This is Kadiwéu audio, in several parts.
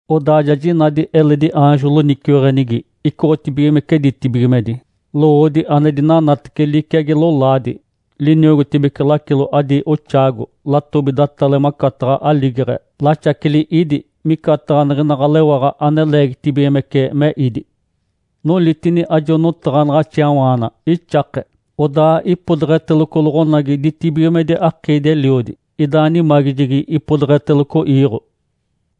Odaa ja jinadi eledi aanjo loniciweɡ̶enigi, icoɡ̶otibigimece ditibigimedi. Lowoodi ane dinanatece liciagi lolaadi, liniogotibece lacilo adi oxaago. Latobi datale macataɡ̶a aligeɡ̶e, laxaceli ídi micataɡ̶a niɡ̶ina ɡ̶alewaɡ̶a ane leegitibigimece me ídi. Nolitini ajo notaɡ̶anaɡ̶axiawaana ixake. Odaa ipodeɡ̶eteloco loɡ̶onagi ditibigimedi akiidi-eliodi, idaa nimagijegi ipodeɡ̶eteloco iiɡ̶o.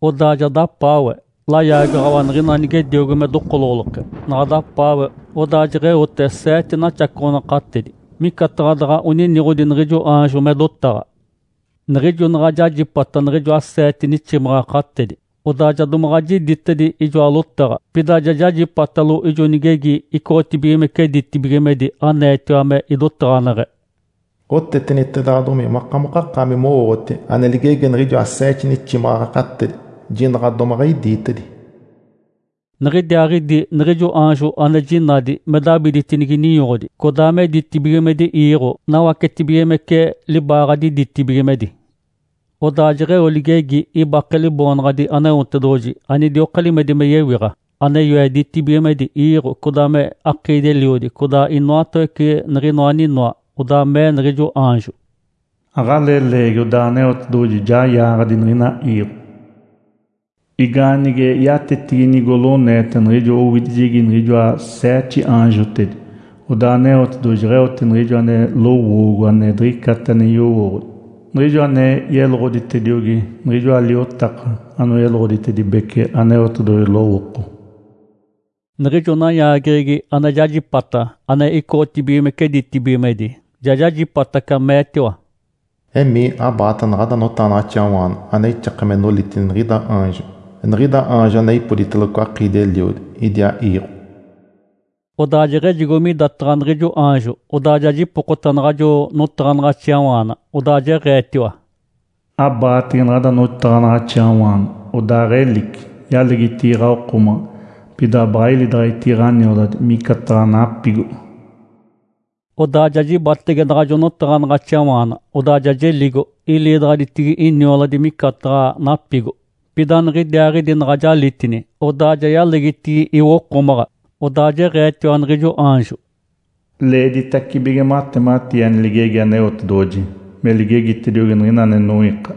Odaa ja dapaawe layaagaɡ̶awa niɡ̶ina nigediogo me dokoloɡ̶oloke. Naɡ̶a dapaawe, odaa jeɡ̶eote seete naxacoɡ̶onakatedi (micataɡ̶a daɡ̶a oniniɡ̶odi niɡ̶ijo aanjo me dotaɡ̶a). Niɡ̶ijo naɡ̶a jajipata niɡ̶ijoa seete niximaɡ̶akatedi, odaa ja domaɡ̶a jiditedi ijoa lotaɡ̶a. Pida ja jajipatalo ijo nigegi icoɡ̶otibigimece ditibigimedi aneetiwa me idotaɡ̶aneɡ̶e, “Otetenitedaɡ̶adomi makamokakaami mowooɡ̶oti ane ligegi niɡ̶ijoa seete niximaɡ̶akatedi. Jinaɡ̶a domaɡ̶a idiitedi!” Niɡ̶idiaaɡ̶idi niɡ̶ijo aanjo ane jinadi me dabiditinigi ninyoɡ̶odi codaa me ditibigimedi iiɡ̶o, nawacetibigimece libaaɡ̶adi ditibigimedi. Odaa jeɡ̶eo ligegi ibake Liboonaɡ̶adi Aneotedoɡ̶oji, anidioka limedi me yewiɡ̶a, ane yoe ditibigimedi, iiɡ̶o, codaa me akiidi-eliodi, codaa inoatawece niɡ̶inoa aninoa. Odaa mee niɡ̶ijo aanjo, “Aɡ̶alee leegi odaa Aneotedoɡ̶oji ja yaaɡ̶adi niɡ̶ina iiɡ̶o. Igaanige yatetigi nigoloneeta niɡ̶ijo owidijegi niɡ̶ijoa seete aanjotedi, odaa Aneotedoɡ̶oji jeɡ̶eote niɡ̶ijo ane lowoogo ane diɡ̶icata ane yowooɡ̶odi, niɡ̶ijo ane yeloɡ̶oditediogi niɡ̶ijoa liotaka anoyeloɡ̶oditedibece Aneotedoɡ̶oji lowooko.” Niɡ̶ijo nayaageɡ̶egi ane jajipata ane icoɡ̶otibigimece ditibigimedi ja jajipataca, meetiwa, “Emii, abaata naɡ̶ada notaɡ̶anaɡ̶axiawaana ane ixake me nolitini niɡ̶ida aanjo, niɡ̶ida aanjo ane ipoditeloco akiidi-eliodi, idiaa iiɡ̶o.” Odaa jeɡ̶ejigo midataɡ̶a niɡ̶ijo aanjo, odaa ja jipokota naɡ̶ajo notaɡ̶anaɡ̶axiawaana. Odaa jeɡ̶eetiwa, “Abaatege naɡ̶ada notaɡ̶anaɡ̶axiawaana, odaaɡ̶elici! Yalegitigi ɡ̶awokomaɡ̶a, pida baɡ̶a ilidaɡ̶aditigi ɡ̶anioladi micataɡ̶a napigo.” Odaa ja jibatege naɡ̶ajo notaɡ̶anaɡ̶axiawaana, odaa ja jeligo. Ilidaɡ̶aditigi inioladi micataɡ̶a napigo. Pida niɡ̶idiaaɡ̶idi naɡ̶a jalitini, odaa ja yalegitigi iwokomaɡ̶a. Odaa jeɡ̶eetiwa niɡ̶ijo aanjo, “Leeditacibige matematii ane ligegi Aneotedoɡ̶oji me ligegitediogi niɡ̶ina ane noiika,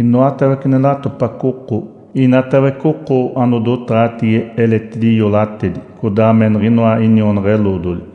inoatawece ane latopaco oko, inatawece oko anodotaɡ̶atigi eletidi iolatedi, codaa me niɡ̶inoa inionaɡ̶a-eloodoli.”